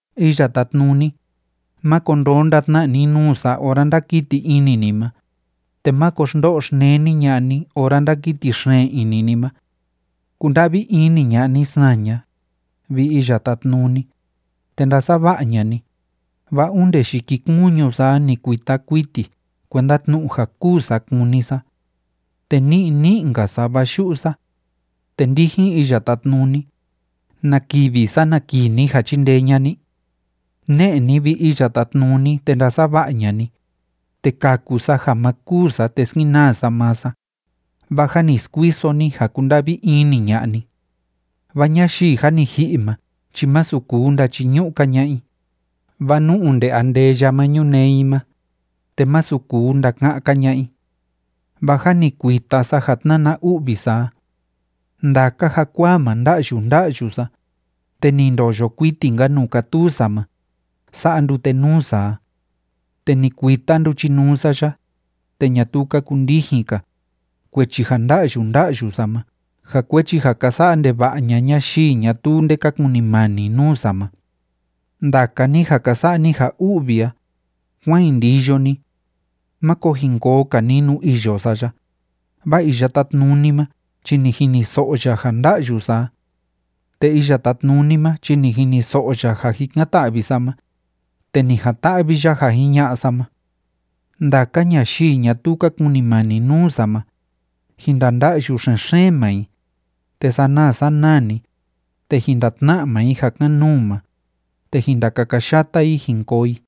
Iya Tátnuni, máko ndonda tna ni nuu sa ora ndákiti ini ni ma, te máko xndo'o xneni ña'a ni ora ndákiti xeen ini ni ma. Kunda'vi ini ña'a ni saña, vi Iya Tátnuni, te ndasava'a ña'a ni, vaa onde yikikuñu sa a ni kuita kuiti kuenda tnu'u ja kûu sa kúni sa. Te ní'i ní'i‑nka sa, vaa yu'u sa. Te ndijin Iya Tátnuni, ¿na kivi sana kii ni ja chindee ña'a ni? Ne'e ni, vi Iya Tátnuni, te ndasava'a ña'a ni, te kaku sa ja ma kûu sa te skenaa sa maa sa, vaa jâ ni skuiso ni ja kúnda'vi ini ña'a ni. Vaa ñayii jâ ni ji'i ma chi masu kuu ndachiñu'u‑ka ña'a i, vaa nú onde andeya ma ñunee i ma, te masu kuu ndaka'an‑ka ña'a i. Vaa jâ ni kuita sa ja tnána u'vi sa a. Ndaka jakuaa ma nda'yu nda'yu sa, te ni ndoyo kuiti‑nka nuu kátuu sa ma, sa'a ndute nuu sa a. Te ni kuita nduchinuu sa ya, te ñatuu ka kundijin‑ka, kuechi ja nda'yu nda'yu sa ma ja kuechi ja ka sa'a ndeva'a ña'a ñayii ñatuu nde ka kunimani nuu sa ma. Ndaka ni ja ka sa'a ni ja u'vi a, kuán jin ndiyo ni. Máko jin koo‑ka ni nuu iyo sa ya, vaa Iya Tátnuni ma chi ni jiniso'o ya ja nda'yu sa a. Te Iya Tátnuni ma chi ni jiniso'o ya ja jikan‑ta'vi sa ma, te ni jan‑ta'vi ya ja jiña'a sa ma. Ndaka ñayii ñatuu ka kunimani nuu sa ma, jin ndanda'yu xen‑xeen maa i, te sanaa sanaa‑ni, te jin ndatna'a maa i ja kan‑nuu ma, te jin ndakakayata i jin koo i.